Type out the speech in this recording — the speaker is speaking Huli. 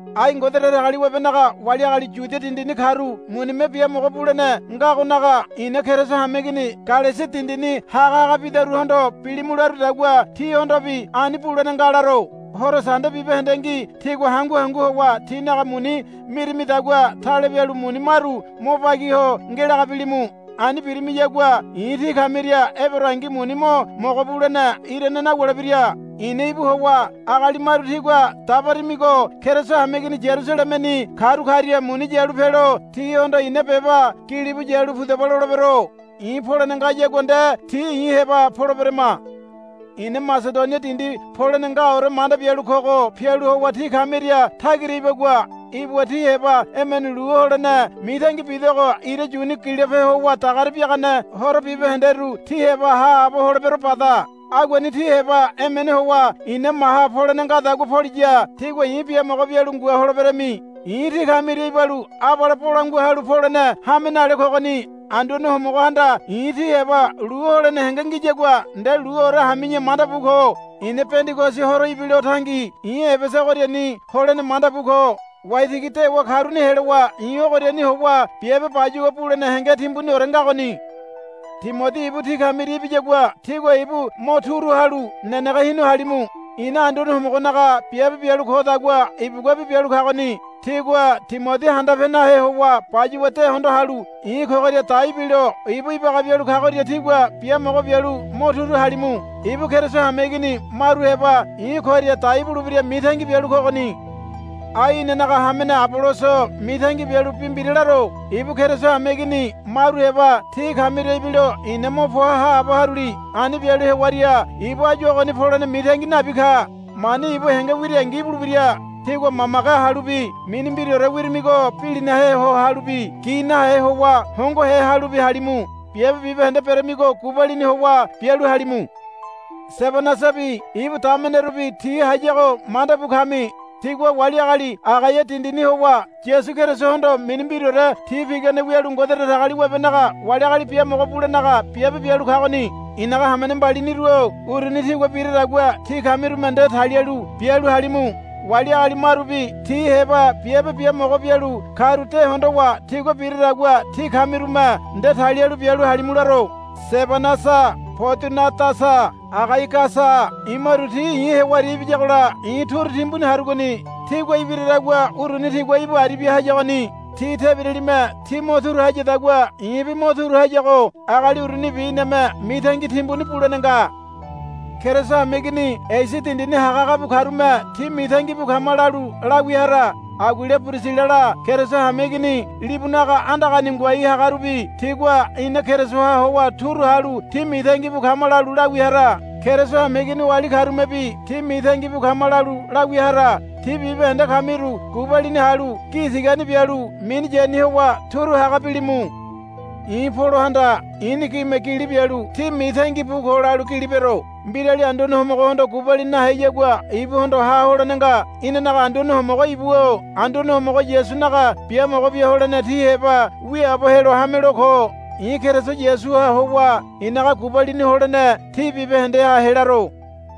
Ai Ngode Datagaliwabenaga wali agali Yudia dindini karu munime biamogo bulene ngagonaga i̱na Keriso hameigini Galesia dindini hagahaga bidaruhondo bilimu larudagua tíhondobi ani bulene nga laro. Horo Sande bibahendengi tígua hangu hangu howa tínaga muni mirimidagua tale bialu muni maru mo bagi ho ngelaga bilimu. Ani birimiyagua i̱ tí kamiria eberoangi muni mo mogo bulene irane nawulebira. I̱na íbu howa agali maru tígua dabarimigo Keriso hameigini Yarusalemeni karu karia muni yalu pelo tihondo i̱na beba gilibu yalu pudaba lolebero. I̱ polene ngayagua nde ti i̱ heba poleberema. I̱na Masedonia dindi polene ngaore manda bialu kogo pialu howa tí kamiria tagira ibagua. Ibuwa tí heba emene lu holene mitangi bidogo ira yuni gilope howa dagare biagane horo bibahenderu tí heba haabo holebero bada. Aguani tí heba emene howa i̱na maha polene ngadagua poliya tígua i̱ biamogo bialu ngua holeberami. I̱ tí kamiria ibalu abale bolangua halu polene hame nale kogoni. Anduane Homogohanda i̱ tí heba lu holene henge ngiyagua nde luore hami̱ya manda bu ko. I̱na Pendigosi horo ibilo tangi i̱ Ebesa ogoriani holene manda bu ko. Waitigi dewa karuni helowa i̱ ogoriani howa biabe bayuwa bulene henge timbuniore ngagoni. Timodi ibu tí kamiria ibiyagua tígua ibu mo turu halu nenege hinu halimu. I̱na Anduane Homogonaga biabe bialu kodagua ibuguabi bialu kagoni. Tígua Timodi handape nahe howa bayuwa de hondo halu i̱ kogoria dai bilo ibu ibaga bialu kagoria tígua biamogo bialu mo turu halimu. Ibu Keriso hameigini maru heba i̱ koria dai bulebira mitangi bialu kogoni. Ai inanaga hamene Aboloso mitangi bialu bi mbira laro. Ibu Keriso hameigini maru heba tí kamiria ibilo i̱na mo poa haabo haruli. Ani bialu hewaria ibu áyu ogoni polene mitangi nabi ka. Mani ibu henge wirangi ibulebira. Tígua mamage halubi mini mbiraore wirimigo bilinahe ho halubi gi nahe howa hongohe halubi halimu. Biabe bibahende beremigo gubalini howa bialu halimu. Sebanasabi ibu damenerubi ti hayago manda bu kami. Tigua wali agali Agaia dindini howa Yasu Kerisohondo mini mbiraore ti pigane wialu Ngode Datagaliwabenaga wali agali biamogo bulenaga biabe bialu kagoni. I̱naga hamene mbaliniru-o uruni tigua biradagua tí kamirume nde talialu bialu halimu. Wali agali marubi ti heba biabe biamogo bialu karu de hondowa tigua biradagua tí kamirume nde talialu bialu halimu laro. Sebanasa Podunadasa Agaigasa imaru ti i̱ hewaria ibiyagola i̱ turu timbuni harugoni. Tígua ibiradagua uruni tigua íbu aribia hayagoni. Ti tebiralime tí mo turu hayadagua i̱bi mo turu hayago agali urunibi iname mitangi timbuni bulene nga. Keriso hameigini Esia dindini hagahaga bu karume, Tí mitangi bu kama, lalu lawia hara. Aguila Pirisilala Keriso hameigini libunaga andagani ngoai hagarubi tigua, Ina Kerisoha howa turu halu tí mitangi bu kama, lalu lawia hara. Keriso hameigini oali karumebi, Tí mitangi bu kama, lalu lawia hara. Tí bibahende kamiru gubalini halu gi tigani bialu mini yani howa turu haga bilimu. I̱ Polohanda i̱ni gime gili bialu, Tí mitangi bu ko, lalu gili bero. Mbirali Anduane Homogohondo gubalini naheyagua ibuhondo ha holene nga. Inanaga Anduane Homogo íbu-o. Anduane Homogo Yasunaga biamogo bia holene tí heba wiaabo helo hamelo ko. I̱ Keriso Yasuha howa i̱naga gubalini holene tí bibahendeha helaro.